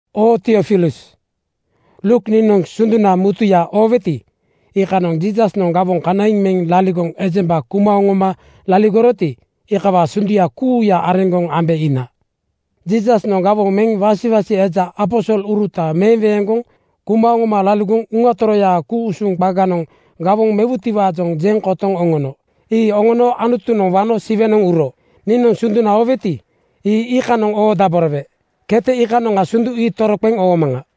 Oo Tiofilus, Luuk niinoŋ sunduna mutuya ooweti, iikanoŋ Jiisasnoŋ gawoŋ kanaiŋ meŋ liligoŋ ejemba kuma oŋoma laligoroti, iikawaa sunduya kuuya areŋgoŋ ambe iina. Jiisasnoŋ gawoŋ meŋ wasiwasi eja aposoluruta meweeŋgoŋ kuma oŋoma laligoŋ Uŋa Toroyaa ku-usuŋ qaganoŋ gawoŋ mewutiwaajoŋ jeŋ kotoŋ oŋono. Ii oŋono Anutunoŋ wano Siwenoŋ uro. Niinoŋ sunduna ooweti, ii iikanoŋ oodaborowe. Kete iikanoŋa sundu ii toroqeŋ oomaŋa.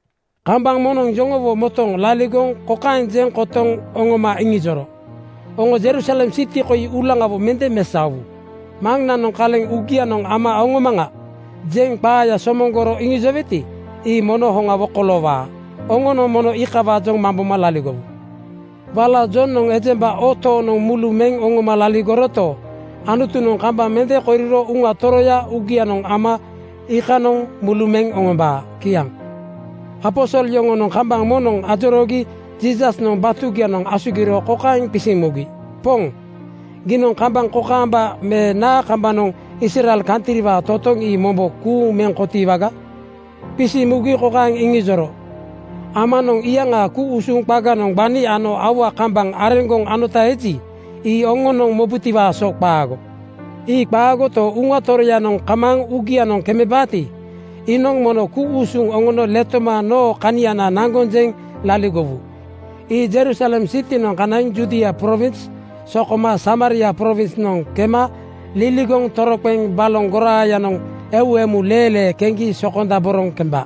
Kambaŋ moŋnoŋ yoŋowo motooŋ laligoŋ kokaeŋ jeŋ kotoŋ oŋoma iŋijoro, “Oŋo Jerusalem siti koi uulaŋawo mende mesaowu. Maŋnanoŋ ‘Kaleŋ uugianoŋ ama oŋomaŋa,’ jeŋ qaaya somoŋgoro iŋijoweti, ii mono hoŋawo koloowaa. Oŋonoŋ mono iikawaajoŋ mamboma laligowu. Wala Jonoŋ ejemba oo tooŋnoŋ mulu meŋ oŋoma laligoroto, Anutunoŋ kambaŋ mende koriro Uŋa Toroya uugianoŋ ama iikanoŋ mulu meŋ oŋombaa.” Kiaŋ. Aposol yoŋonoŋ kambaŋ moŋnoŋ ajoroogi Jiisasnoŋ batugianoŋ asugiro kokaeŋ qisiŋ mugi, “Poŋ, giinoŋ kambaŋ kokaamba me naa kambanoŋ Israel kantriwaa totoŋ ii mombo kuuŋ meŋ kotiiwaga?” Qisiŋ mugi kokaeŋ iŋijoro, “Amanoŋ iyaŋaa ku-usuŋ qaganoŋ gbani ano aua kambaŋ areŋgoŋ anota eji, ii oŋonoŋ mobutiwaa so qaago. Ii qaagoto, Uŋa Toroyanoŋ kamaaŋ uugianoŋ kemebaati, iinoŋ mono ku-usuŋ oŋono letoma noo kaniana naŋgoŋ jeŋ laligowu. Ii Jerusalem sitinoŋ kanaiŋ Judia prowins sokoma Samaria prowinsnoŋ kema liligoŋ toroqeŋ baloŋ goraayanoŋ eu emu leelee keŋgi sokondaboroŋ kemba.”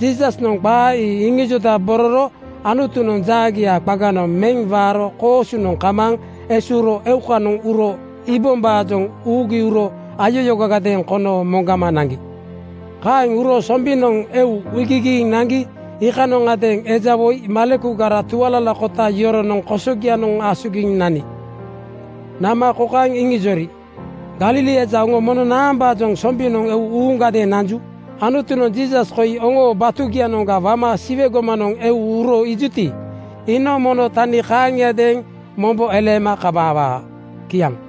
Jiisasnoŋ qaa ii iŋijondabororo Anutunoŋ jaagia qaganoŋ meŋ waaro koosunoŋ kamaaŋ esuuro eukanoŋ uro iibombaajoŋ uugi uro ayayoogagadeeŋ kono moŋgama naŋgi. Kaeŋ uro sombinoŋ eu iigigiiŋ naŋgi iikanondeeŋ eja woi malekugara tualalakota yoronoŋ kosogianoŋ asugiŋ nani. Nama kokaeŋ iŋijori, “Galili eja oŋo mono naambaajoŋ sombinoŋ eu uuŋgadeeŋ nanju? Anutunoŋ Jiisas koi oŋoo batugianoŋga wama Siwe gomanoŋ eu uro iijuti, iinoŋ mono tani kaaŋiadeeŋ mombo eleema kamaawaa.” Kiaŋ.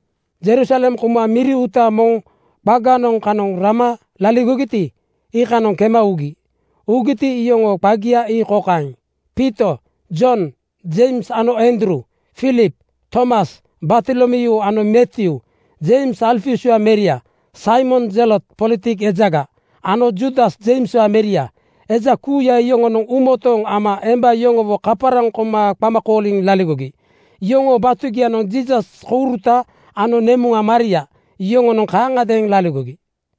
Jerusalem kouma miri uuta moŋ qaganoŋ kanoŋ rama laligogiti, iikanoŋ kema ugi. Ugiti, iyoŋoo qagia ii kokaeŋ: Piito, Jon, Jeims ano Andruu; Filip, Tomas, Bartolomyuu ano Matyuu, Jeims Alfiuswaa meria, Saimon Zelot politik ejaga ano Juudas Jeimswaa meria Eja kuuya yoŋonoŋ uumotooŋ ama emba yoŋowo kaparaŋ koma qama kooliŋ laligogi. Yoŋoo batugianoŋ Jiisas kouruta ano nemuŋa Maria yoŋonoŋ kaaŋagadeeŋ laligogi.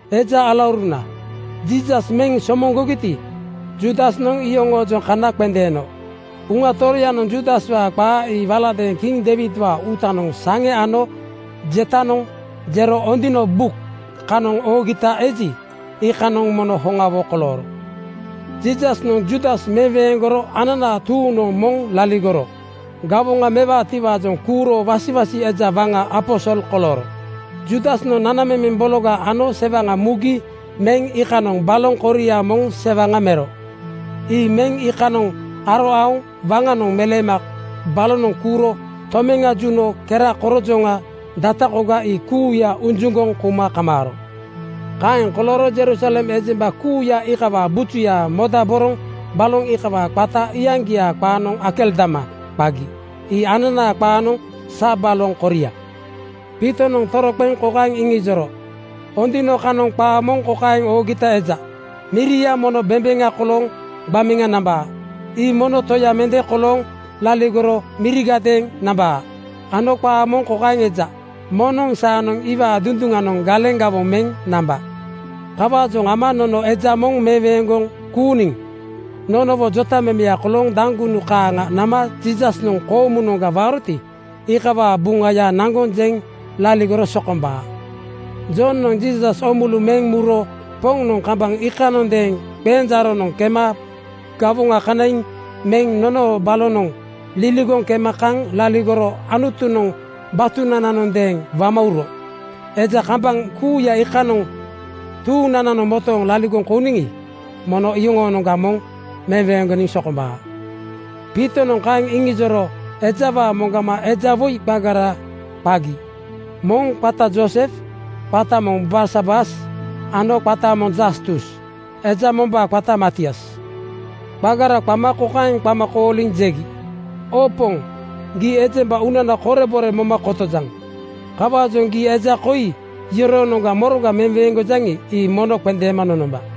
“Eja alauruna, Jiisas meŋ somoŋgogiti, Juudasnoŋ iyoŋoojoŋ kana qendeeno. Uŋa Toroyanoŋ Juudaswaa qaa ii waladeeŋ kiŋ Deiwidwaa uutanoŋ saŋe ano jetanoŋ jero Ondino buk (Buk Song) kanoŋ oogita eji, iikanoŋ mono hoŋawo kolooro. Jiisasnoŋ Juudas meweeŋgoro ananaa tuuŋnoŋ moŋ laligoro gawoŋa mewaatiwaajoŋ kuuro wasiwasi eja waŋa aposol kolooro. “Juudasnoŋ nanamemeŋ bologa ano sewaŋa mugi meŋ iikanoŋ baloŋ koria moŋ sewaŋa mero. Ii meŋ iikanoŋ aro aoŋ waŋanoŋ meleema balonoŋ kuuro tomeŋa juno kera korojoŋa data koga ii kuuya ujuŋgoŋ kouma kamaaro. Kaeŋ kolooro Jerusalem ejemba kuuya iikawaa bujuya modaboroŋ baloŋ iikawaa qata iyaŋgiaa qaanoŋ Akeldama qagi. Ii ananaa qaanoŋ Sa Baloŋ koria.” Piitonoŋ toroqeŋ kokaeŋ iŋijoro, “Ondino (Buk Song) kanoŋ qaa moŋ kokaeŋ oogita eja, ‘Miria mono bembeŋa kolooŋ gbameŋa namba. Ii moŋnoŋ toya mende kolooŋ laligoro mirigadeeŋ namba,’ ano qaa moŋ kokaeŋ eja, ‘Moŋnoŋ saanoŋ iwaa dunduŋanoŋ galeŋ gawoŋ meŋ namba.’ “Kawaajoŋ ama nono eja moŋ meweeŋgoŋ kuuniŋ nonowo jotamemeya kolooŋ daŋgunu kaaŋa nama Jiisasnoŋ koomunoŋga waaroti, iikawaa Buŋaya naŋgoŋ jeŋ laligoro sokombaa. Jonoŋ Jiisas oomulu meŋ muro Poŋnoŋ kambaŋ iikanondeeŋ qenjaaronoŋ kema gawoŋa kanaiŋ meŋ nonoo balonoŋ liligoŋ kema kaŋ laligoro Anutunoŋ batunananondeeŋ wama uro. Eja kambaŋ kuuya iikanoŋ tuuŋnananoŋ motooŋ laligoŋ kouniŋi, mono iyoŋoonoŋga moŋ meweeŋgoniŋ sokombaa.” Piitonoŋ kaeŋ iŋijoro ejawaa moŋgama eja woi qagara qagi. Moŋ qata Joosef, qata moŋ Barsabas ano qata moŋ Jastus. Eja mombaa qata Matias. Qagara qama kokaeŋ qama kooliŋ jegi, “Oo Poŋ, gii ejemba uunana korebore moma kotojaŋ. Kawaajoŋ gii eja koi yoroonoŋga moroga meweeŋgojaŋi, ii mono qendeema nonomba.